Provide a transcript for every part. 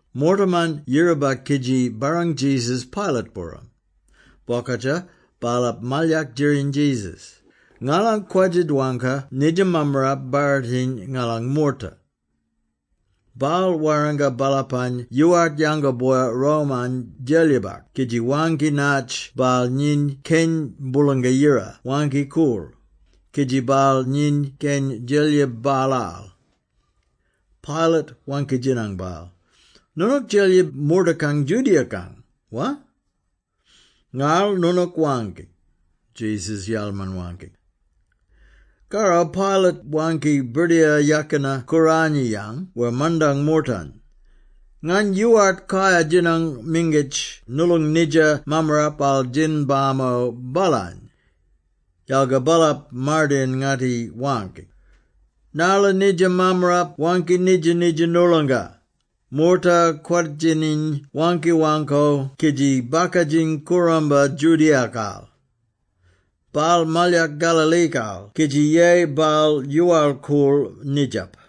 Moortaman yiraba kidji barrang Jesus Pilate-booram. Bokadja, baalap malyak djiriny Jesus, “Ngala kwadja-dwangka nidja mammarap barritiny ngalang moorta. Baal warranga baalapany yoowart yango boya Rome-ang Djelyibak kidji waangki natj baal nyiny Keny Boolanga Yira Waangki-Koorl, kidji baal nyiny keny djelyib baalaal.” Pilate waangki-djinang baal, “Noonook Djelyib moortakang Judea-kang, wa?” “Ngarl noonook waangki,” Jesus yalman-waangki. Karro Pilate waangki Birdiyara Yakina-Kooranyiyang wer mandang moortany, “Ngany yoowart kayar-djinang mingitj noolong nidja mammarapal djin-bamo baalany.” Yalga baalap mardayin-ngatti waangki, “Narla nidja mammarap waangki nidja-nidja noolonga, moorta kwadjininy waangki-waangko kidji bakadjiny kooramba Judea-kal. Baal malyak Galilee-kal kidji yeyi baal yoowal-koorl nidjap.”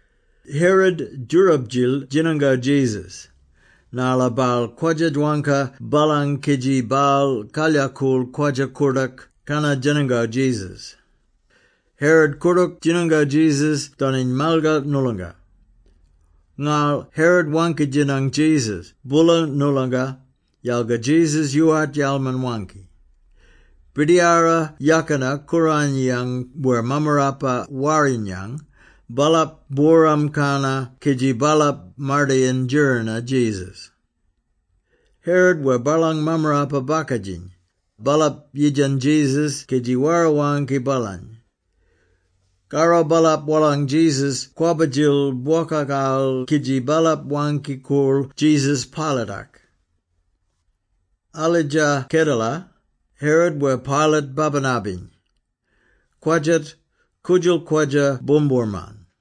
Herod djoorab-djil djinango Jesus, narla baal kwadja-dwangka baalang kidji baal kalyakool kwadja-koordook kannar djinango Jesus. Herod koordook djinango Jesus doniny malgar noolonga. Ngarl Herod waangki-djinang Jesus boola noolonga, yalga Jesus yoowart yalman-waangki. Birdiyara Yakina-Kooranyiyang wer Mammarapa-Warrinyang, baalap booram-kanna kidji baalap mardayin djirina Jesus. Herod wer baalang mammarapa-bakadjiny, baalap yidjan Jesus kidji wara-waangki baalany. Karro baalap wolang Jesus kwabba-djil bwokakal kidji baalap waangki-koorl Jesus Pilate-ak. Aldja kedela, Herod wer Pilate babina-biny. Kwadjat, koodjal kwadja boomboorman.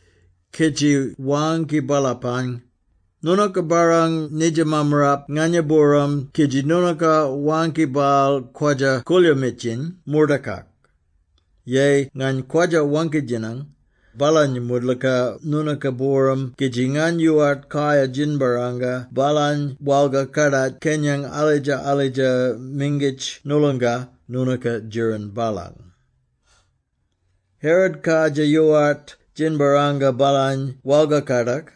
kidji waangki baalapany, “Noonooka barrang nidja mammarap nganya-booram kidji noonooka waangki baal kwadja-koolyoomitjiny moortakak. Yeyi ngany kwadja-waangki-djinang baalany moodlooka noonooka-booram kidji ngany yoowart kayar djinbarranga baalany walgar-kadak kenyang alidja-alidja mingitj noolonga noonooka djirin baalang. Herod kardjir yoowart djinbarranga baalany walgar-kadak,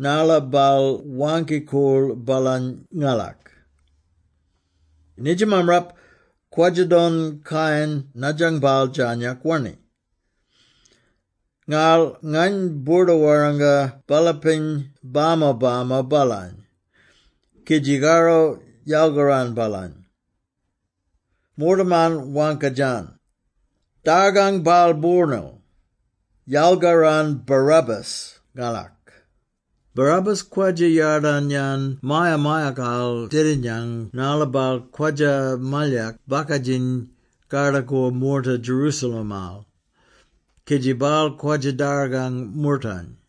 narla baal waangki-koorl baalany ngalak. Nidja mammarap kwadja-don kayan nadjang baal djarnyak wanni. Ngarl ngany boorda-warranga baalapany bama-bamo baalany, kidji karro yalgaran baalany.” Moortaman waangka-djan, “Dargang baal boornil! Yalgaran Barabbas ngalak!” (Barabbas kwadja yadarn-yan maya-mayakal dedinyang narla baal kwadja-malyak bakadjiny kardakor moorta Jerusalem-al, kidji baal kwadja-dargang moortany.)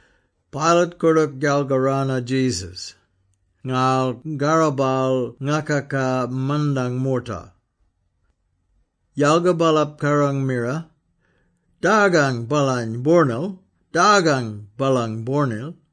Pilate koordook yalgarano Jesus, ngarl karro baal ngakaka mandang moorta. Yalga baalap kaarang-mira, “Dargang baalany boornil! Dargang baalany boornil!”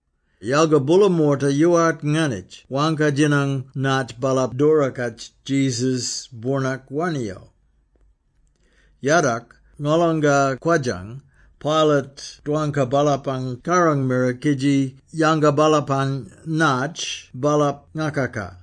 Yalga boola moorta yoowart nganitj waangka-djaniny natj baalap doora-katj Jesus boornak wanniyo. Yadok, ngolonga kwodjang, Pilate dwangka baalapang kaarang-mira kidji yanga baalapany natj baalap ngakaka.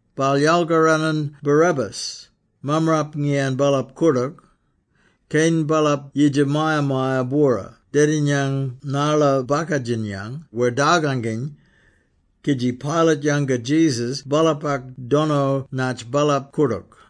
Baal yalkaranan Barabbas, mammarap ngiyan baalap koordook, keny baalap yidja maya-maya-bwora dedinyang narla bakadjinyang wer darganginy, kidji Pilate yanga Jesus baalapak dono natj baalap koordook.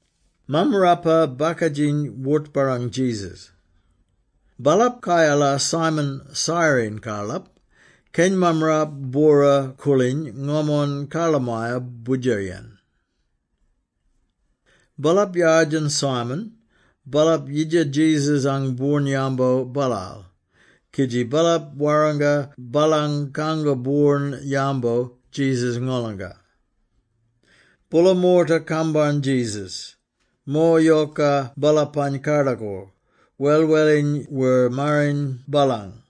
Mammarapa-bakadjiny wort-barrang Jesus. Baalap kayalar Simon Cyrene-karlap, keny mammarap bwora-koorliny ngomon karlamaya boodjeryen. Baalap yardjan Simon, baalap yidja Jesus-ang boorn-yambo baalal, kidji baalap warranga baalany kango boorn-yambo Jesus-ngolanga. Boola moorta kambarn Jesus; mo yoka baalapany kardakor, welweliny wer mariny baalang.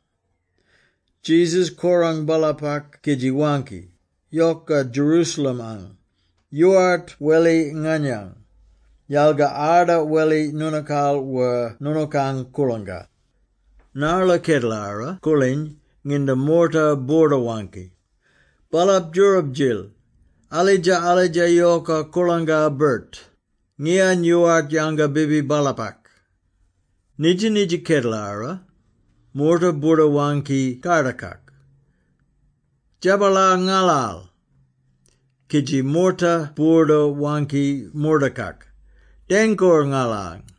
Jesus korang baalapak kidji waangki, “Yoka Jerusalem-ang! Yoowart weli nganyang, yalga arda weli noonookaal wer noonookang koorlangka. Narla kedelara koorliny nginda moorta boorda-waangki. ‘Baalap djoorab-djil, alidja-alidja yoka koorlangka-birt, ngiyan yoowart yanga bibi baalapak!’ Nidja-nidja kedelara, moorta boorda-waangki kardakak, ‘Djabalar ngalal!’ Kidji moorta boorda-waangki mordakak, ‘Dengkoor ngalany!’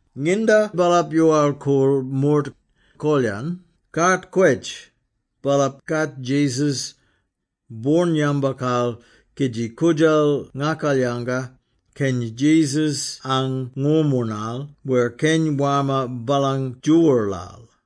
Nginda baalap yoowal-koorl mord, kol-yan ‘Kaat Kwetj’, baalap katj Jesus boorn-yambokal, kidji koodjal ngakalyanga, keny Jesus-ang ngoornmoornal wer keny warma baalang djoowoorlal.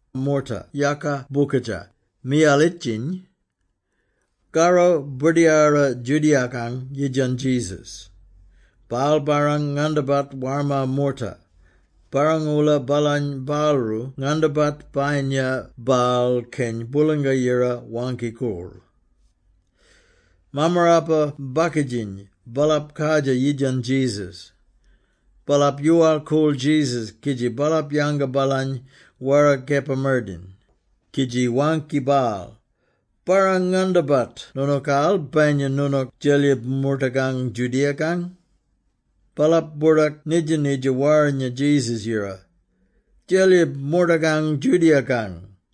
Moorta yaaka bokadja, miyalitjiny. Karro birdiyara Judea-kang yidjan Jesus, “Baal barrang-ngandabat warma moorta, barrang-oola baalany baalroo ngandabat bayinya baal Keny Boolanga-Yira Waangki-Koorl.” Mammarapa-bakadjiny, baalap kardjir yidjan Jesus. Baalap yoowal-koorl Jesus kidji baalap yanga baalany wara kepa-mardayin, kidji waangki baal, “Barrang-ngandabat noonookaal bayinya noonook djelyib moortagang Judea-kang!” Baalap boordak nidja-nidja warrinya Jesus-yira: ‘Djelyib moortakang Judea-kang.’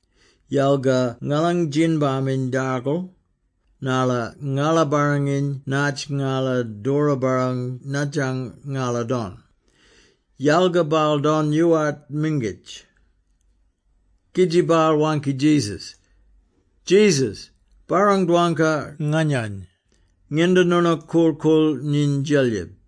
Yalga ngalang djin-baminy darkal, narla ngala barranginy naatj ngala doora-barrang nadjang ngala don; yalga baal don yoowart mingitj.” Kidji baal waangki Jesus, “Jesus, barrang-dwangka nganyany, nginda noonook korl-koorl nyiny Djelib!”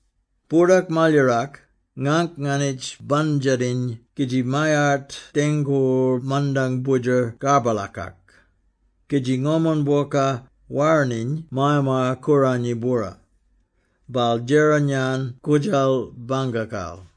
Boordak malyarak, ngangk nganitj bandjatiny kidji mayart dengkoor mandang boodjer karbalakak; kidji ngomon bwoka, waraniny Maya-maya-Kooranyi-bwora, baal djeran-yan koodjal bangkakal.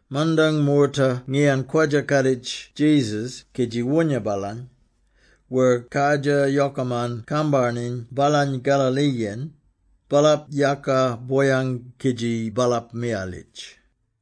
Mandang moorta ngiyan kwadja-kaaditj Jesus kidji woonya baalany, wer kardjir yokaman kambarniny baalany Galilee-yen, baalap yaaka boyang kidji baalap miyalitj.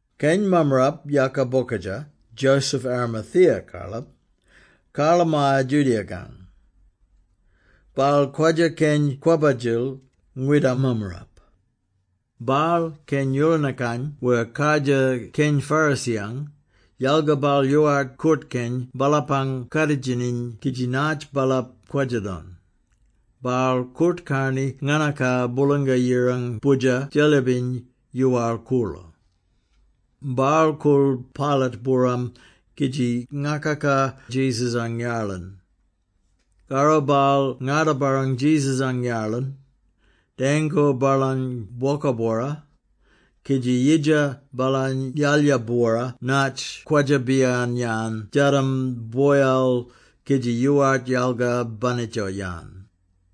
Keny mammarap yaaka bokadja, Joseph Arimathea-karlap, karlamaya Judea-kang. Baal kwadja keny kwabbadjil, ngwidam mammarap. Baal keny Yoolinakang wer kardjir keny Pharisee-yang, yalga baal yoowart koort-keny baalapang kaaditjiny kidji natj baalap kwadja-don. Baal koort-karni nganaka Boolanga Yirang Boodjer Djelyibiny yoowal-koorlo. Baal koorl Pilate-booram kidji ngakaka Jesus-ang yarlin. Karro baal ngarda-barrang Jesus-ang yarlin, dengkoor baalany bwoka-bwora, kidji yidja baalany yalya-bwora natj kwadja-biyan-yan djadam boyal kidji yoowart yalga banitja-yan.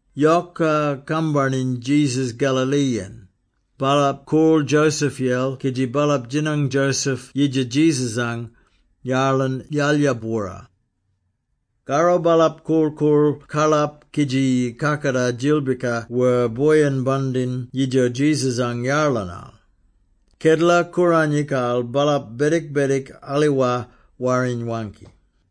Yoka kambarniny Jesus Galilee-yen, baalap koorl Joseph-yel kidji baalap djinang Joseph yidja Jesus-ang yarlin yalya-bwora. Karro baalap korl-koorl karlap kidji kakatar djilbika wer boyin-bandin yidjo Jesus-ang yarlinal. Kedela-Kooranyikal, baalap bedik-bedik, aliwar Warriny waangki.